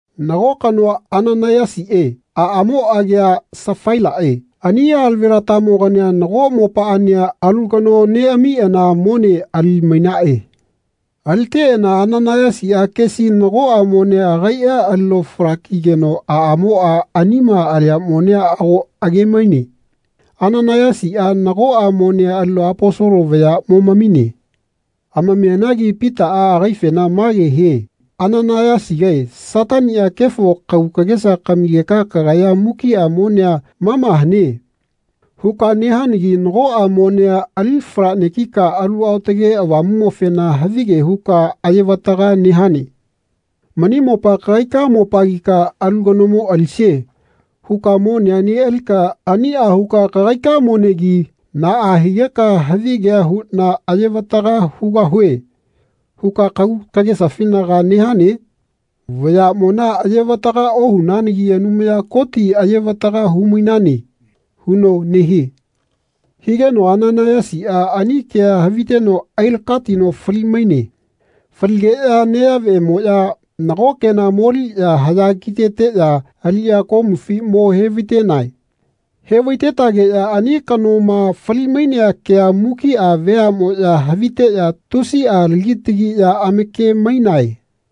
Nago kanoa Ananaiyasiꞌe aꞌamo agia Safailaꞌe ani alavelatamogania nago mopaꞌania alu kano neꞌamiꞌana mone ali-mainaꞌe. Aliteꞌana Ananaiyasiꞌa kesi nagoꞌa monea agaiꞌa alino fala-kigeno aꞌamoꞌa anima alia monea ago age-maine. Ananaiyasiꞌa nagoꞌa monea alino Aposolo vaya momamine. Amamianagi Pitaꞌa agaifena mage hie “Ananaiyasigae Sataniꞌa kefo kagu kagesa kamigeka kagaya ‘Mukiꞌa monea mama hane.’ huka nehanagi nagoꞌa monea ali fala-negika Alu Aotage Avamuꞌmofena havige huka ayevataga nehane. Mani mopa kagaika mopagika ‘Alu kanomo alisie.’ huka monea neꞌalika aniꞌa huka kagaika monegi naꞌa higeka ‘Havigea huꞌna ayevataga hugahue.’ huka kagu kagesafinaga nehane? Vayaꞌmona ayevataga ohunanagi Anumaya Koti ayevataga humainane.” huno nehie. Higeno Ananaiyasiꞌa ani kea haviteno ailakatino fali-maine. Faligeꞌya neyaꞌvemoꞌya nago kena moliꞌya haꞌya kiteteꞌya aliꞌya komufi mo hevaitenae. Hevaitetageꞌya ani kanoma fali-mainea kea mukiꞌa veaꞌmoꞌya haviteꞌya tusiꞌa lagi tagiꞌya amake-mainae.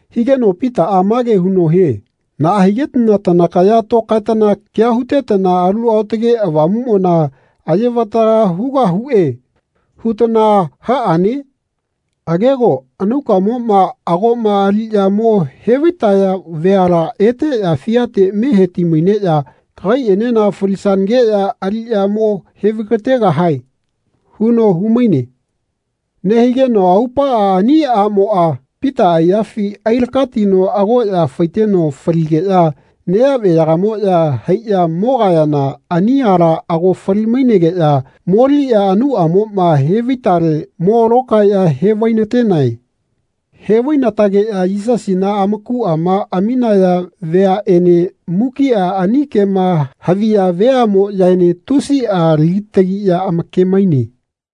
Higeno Pitaꞌa mage huno hie “Naꞌa higetana tanakaya tokaetana kea hutetana ‘Alu Aotage Avamuꞌmona ayevataga hugahuꞌe.’ hutana haꞌane? Agego anaukamoma agoꞌma aliꞌya mo hevaitaya vayala eteꞌya fiate me heti-maineꞌya kagaiꞌenena falisanageꞌya aliꞌya mo hevaigategahae.” huno humaine. Nehigeno aupaꞌa ani aꞌmoꞌa Pita aiyafi ailakatino agoꞌya faiteno faligeꞌya neyaꞌveyagamoꞌya haiꞌya mogayana ani ala ago fali-mainegeꞌya moliꞌya anauꞌamoma hevaitale mo lokaeꞌya hevainatenae. Hevainatageꞌya Yisasina amakuꞌama aminaya veaꞌene mukiꞌa ani kema haviya veaꞌmoꞌyaene tusiꞌa lagitagiꞌya amake-maine.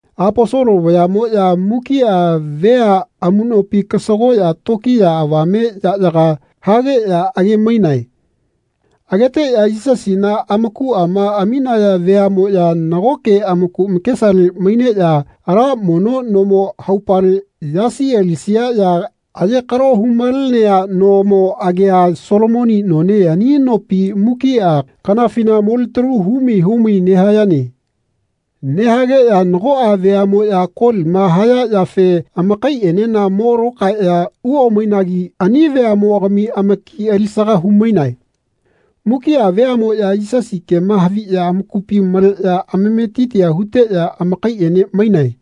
Aposolo vayaꞌmoꞌya mukiꞌa vea amuꞌnopi kasagoꞌya tokiya avame yaꞌyaga hageꞌya age-mainae. Ageteꞌya Yisasina amakuꞌama aminaya veaꞌmoꞌya nagoke amaku amakesale maineꞌya ala mono nomo haupale yasi alisia ya ayekalo humalenea nomo agia Solomoni none ani nopi mukiꞌa kanafina molitalu humai humai nehayane. Nehageꞌya nagoꞌa veaꞌmoꞌya kolima haya yafe amakaiꞌenena mo lokaeꞌya uomainagi ani veaꞌmogami amaki alisaga humainae. Mukiꞌa veaꞌmoꞌya Yisasi kema haviꞌya amakupi maleꞌya amametitia huteꞌya amakaiꞌene mainae.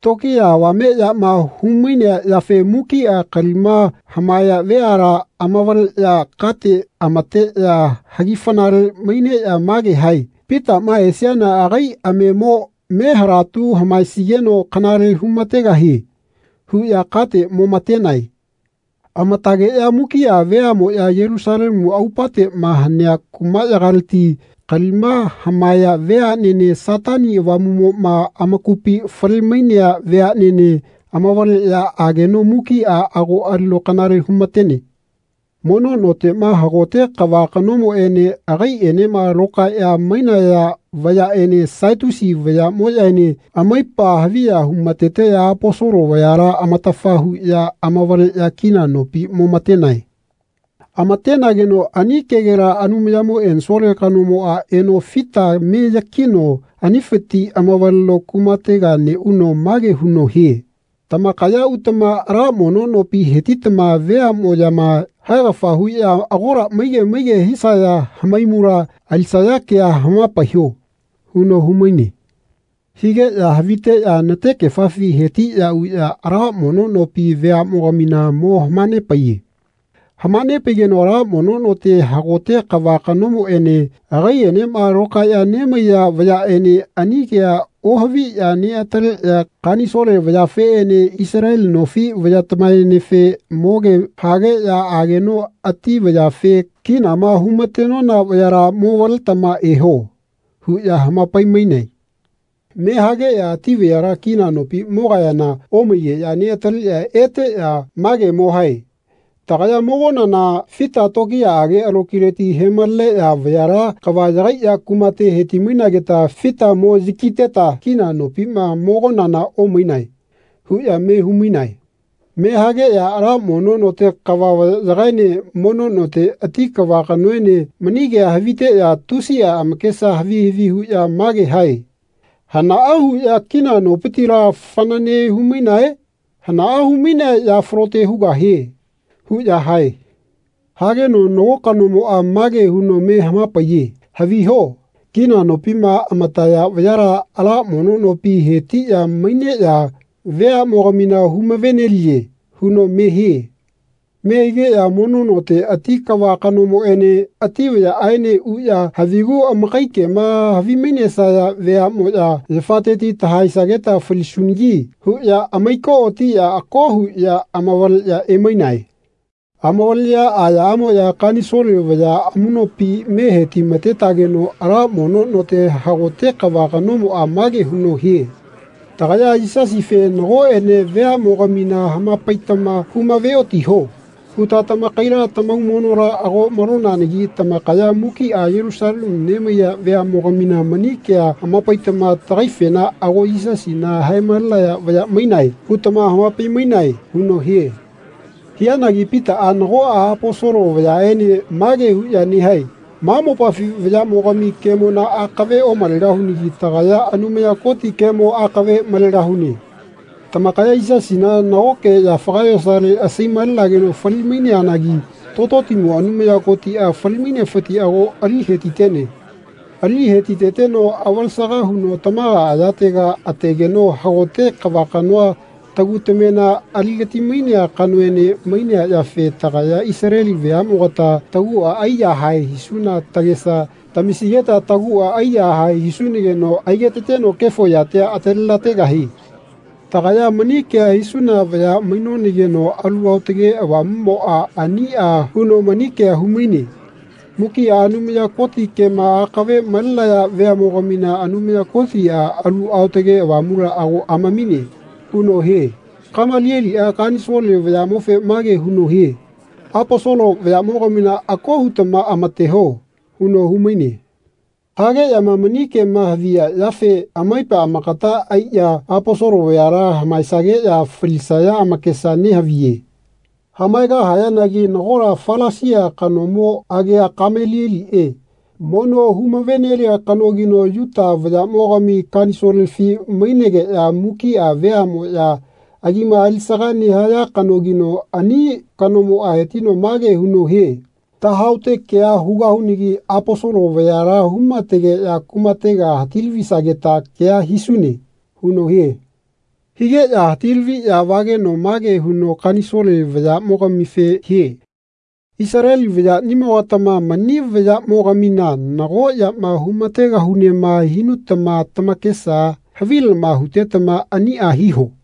Tokiya avameꞌyama humainea yafe mukiꞌa kalima hamaeya veala amavaleꞌya kate amateꞌya hagifanale maineꞌya mage hae “Pitaꞌma esiana agai amemo me halatu hamaesigeno kanale humategahie.” huꞌya kate momatenae. Amatageꞌya mukiꞌa veaꞌmoꞌya Yelusalemu aupateꞌma hanea kumaꞌyagaleti kalima hamaeya veaꞌnene Satani avamuꞌmoꞌma amakupi fale-mainea veaꞌnene amavaleꞌya ageno mukiꞌa ago alino kanale humatene. Mono noteꞌma hagote kava kanomoꞌene agaiꞌenema lokaeꞌya mainaya vayaꞌene Satiusi vayaꞌmoꞌyaene amaipa haviya humateteꞌya Aposolo vayala amatafa huꞌya amavaleꞌya kina nopi momatenae. Amatenageno ani kegela Anumayamo ensole kanomoꞌa eno fita me yakino anifiti amavaleno kumatega neꞌuno mage huno hie “Tamakaya utama ala mono nopi hetitama veaꞌmoꞌyama haegafa huꞌya agola maige maige hisaya hamaimula alisaya kea hamapaiho” huno humaine. Higeꞌya haviteꞌya natekefafi hetiꞌya uꞌya ala mono nopi veaꞌmogamina mo hamanepaiye. Hamanepaigeno ala mono note hagote kava kanomoꞌene agaiꞌenema lokaeꞌya nemaiya vayaꞌene ani kea ohaviꞌya neꞌataleꞌya Kanisole vayafeꞌene Isaleli nofi vayatamaenefe moge hageꞌya ageno ati vayafe “Kinama humatenona vayala momavaletama eho.” huꞌya hamapaimainae. Me hageꞌya ati vayala kina nopi mogayana omaigeꞌya neꞌataleꞌya eteꞌya mage mo hae “Tagaya mogonana fita tokiyaꞌage alokileti hemaleneꞌya vayala kava yagaiꞌya kumate hetimainageta fita mo yakiteta kina nopima mogonana omainae.” huꞌya me humainae. Mehageꞌya ala mono note kava vayaꞌyagaene mono note ati kava kanoene mani kea haviteꞌya tusiꞌa amakesa havi havi huꞌya mage hae “Hanaꞌa huꞌya kina nopitila fanane humainae? Hanaꞌa humainea ya falote hugahie.” huꞌya hae. Hageno nago kanomoꞌa mage huno me hamapaiye “Haviho kina nopima amataya vayala ala mono nopi hetiꞌya maineꞌya veaꞌmogamina humave-neliye.” huno me hie. Me higeꞌya mono note ati kava kanomoꞌene ati vayaꞌaene uꞌya “Havigu amakai kema havimainesaya veaꞌmoꞌya yafateti tahaesageta falisunagi.” huꞌya amaikootiꞌya ako huꞌya amavaleꞌya emainae. Amavaleꞌya ayaꞌamoꞌya Kanisole vaya amuꞌnopi me hetimatetageno ala mono note hagote kava kanomoꞌa mage huno hie. “Tagaya Yisasife nagoꞌene veaꞌmogamina hamapaitama humaveotiho” huta tamakaila tamaumonola ago malonanagi tamakaya mukiꞌa Yelusalemu nemaiya veaꞌmogamina mani kea hamapaitama tagaifena ‘Ago Yisasina hae-malenaya vaya mainae.’ hutama hamapai-mainae.” huno hie. Hianagi Pitaꞌa nagoꞌa Aposolo vayaꞌene mage huꞌya nehae “Ma mopafi vayaꞌmogami kemona akave omalegahunagi tagaya Anumaya Koti kemo akave malegahune. Tamakaya Yisasina nagoke yafaga yosale asai-malageno fali-maineanagi Tototimo Anumaya Kotiꞌa fali-mainefiti ago ali hetitene. Ali hetiteteno avalesaga huno tamaga ayatega ategeno hagote kava kanoa tagu tamema aligatimainea kanoene mainea yafe tagaya Isaleli veaꞌmogata taguꞌa aiyahae hisuna tagesa tamisigeta taguꞌa aiyahae hisunageno aigetateno kefo yatia atalelategahie. Tagaya mani kea hisuna vaya mainonageno Alu Aotage Avamuꞌmoꞌa aniꞌa huno mani kea humaine. Mukiꞌa Anumaya Koti kema akave malenaya veaꞌmogamina Anumaya Kotiꞌa Alu Aotage Avamula ago amamine.” huno hie. Kamalieliꞌa kanisole vayaꞌmofe mage huno hie “Aposolo vayaꞌmogamina ako hutama amateho.” huno humaine. Hageꞌyama mani kema haviya yafe amaipa amakata aiꞌya Aposolo vayala hamaesageꞌya falisaya amakesa nehaviye. Hamaegahayanagi nagola Falasia kanomo agia Kamalieliꞌe mono humave-nelia kanogino Yuta vayaꞌmogami Kanisolefi mainegeꞌya mukiꞌa veaꞌmoꞌya agima alisaga nehaya kanogino ani kanomoꞌa hetino mage huno hie “Tahaote kea hugahunagi Aposolo vayala humategeꞌya kumatega hati-lavisageta kea hisune.” huno hie. Higeꞌya hati-laviꞌya vageno mage huno Kanisole vayaꞌmogamife hie “Isaleli vayaꞌnimogatama mani vayaꞌmogamina nago yama humategahunema hinutama tamakesa havilama hutetama aniꞌa hiho.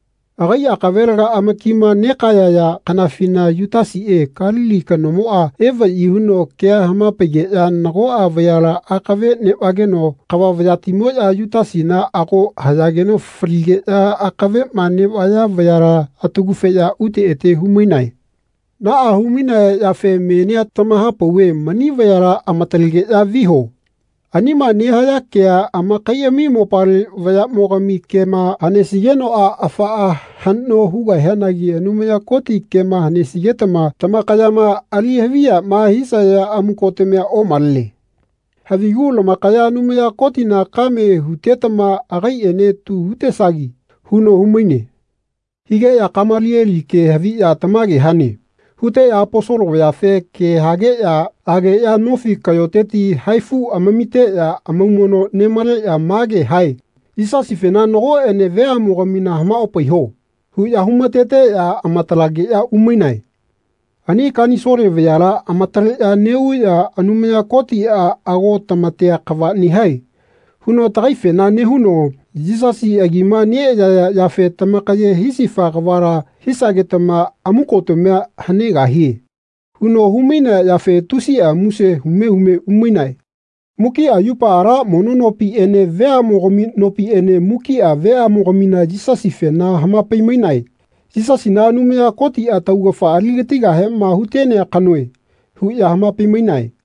Agai akavelega amakima negayaya kanafina Yutasiꞌe Kalili kanomoꞌa evaꞌyi huno kea hamapaigeꞌya nagoꞌa vayala akave neꞌvageno kava vayatimoꞌya Yutasina ago hayageno faligeꞌya akaveꞌma neꞌvaya vayala atagufeꞌya ute ete humainae. Naꞌa humainaya yafe menia tamahapauve mani vayala amatalegeꞌya viho. Anima nehaya kea amakaiꞌami mopale vayaꞌmogami kema hanesigenoꞌa afaꞌa haꞌno hugahianagi Anumaya Koti kema hanesigetama tamakayama ali haviyama hisaya amukotamia omalene. Havigu lamakaya Anumaya Kotina kame hutetama agaiꞌene tu hutesagi.” huno humaine. Higeꞌya Kamalieli ke haviꞌya “Tamage hane.” huteꞌya Aposolo vayafe ke hageꞌya ageꞌya nofi kaꞌyoteti haifu amamiteꞌya amaumono nemaleꞌya mage hae “Yisasifena nagoꞌene veaꞌmogamina hamaopaiho.” huꞌya humateteꞌya amatalageꞌya umainae. Ani Kanisole vayala amataleꞌya neꞌuꞌya “Anumaya Kotiꞌa ago tamatea kava nehae.” huno tagaifena nehuno “Yisasi agima neꞌayaya yafe tamakaye hisifa kavala hisagetama amukotamia hanegahie.” huno humainea yafe tusiꞌa muse hume hume umainae. Mukiꞌa yupa ala mono nopiꞌene veaꞌmogami nopiꞌene mukiꞌa veaꞌmogamina Yisasifena hamapai-mainae. “Yisasina Anumaya Kotiꞌa taugafa aligatigahema hutenea kanoe.” huꞌya hamapai-mainae.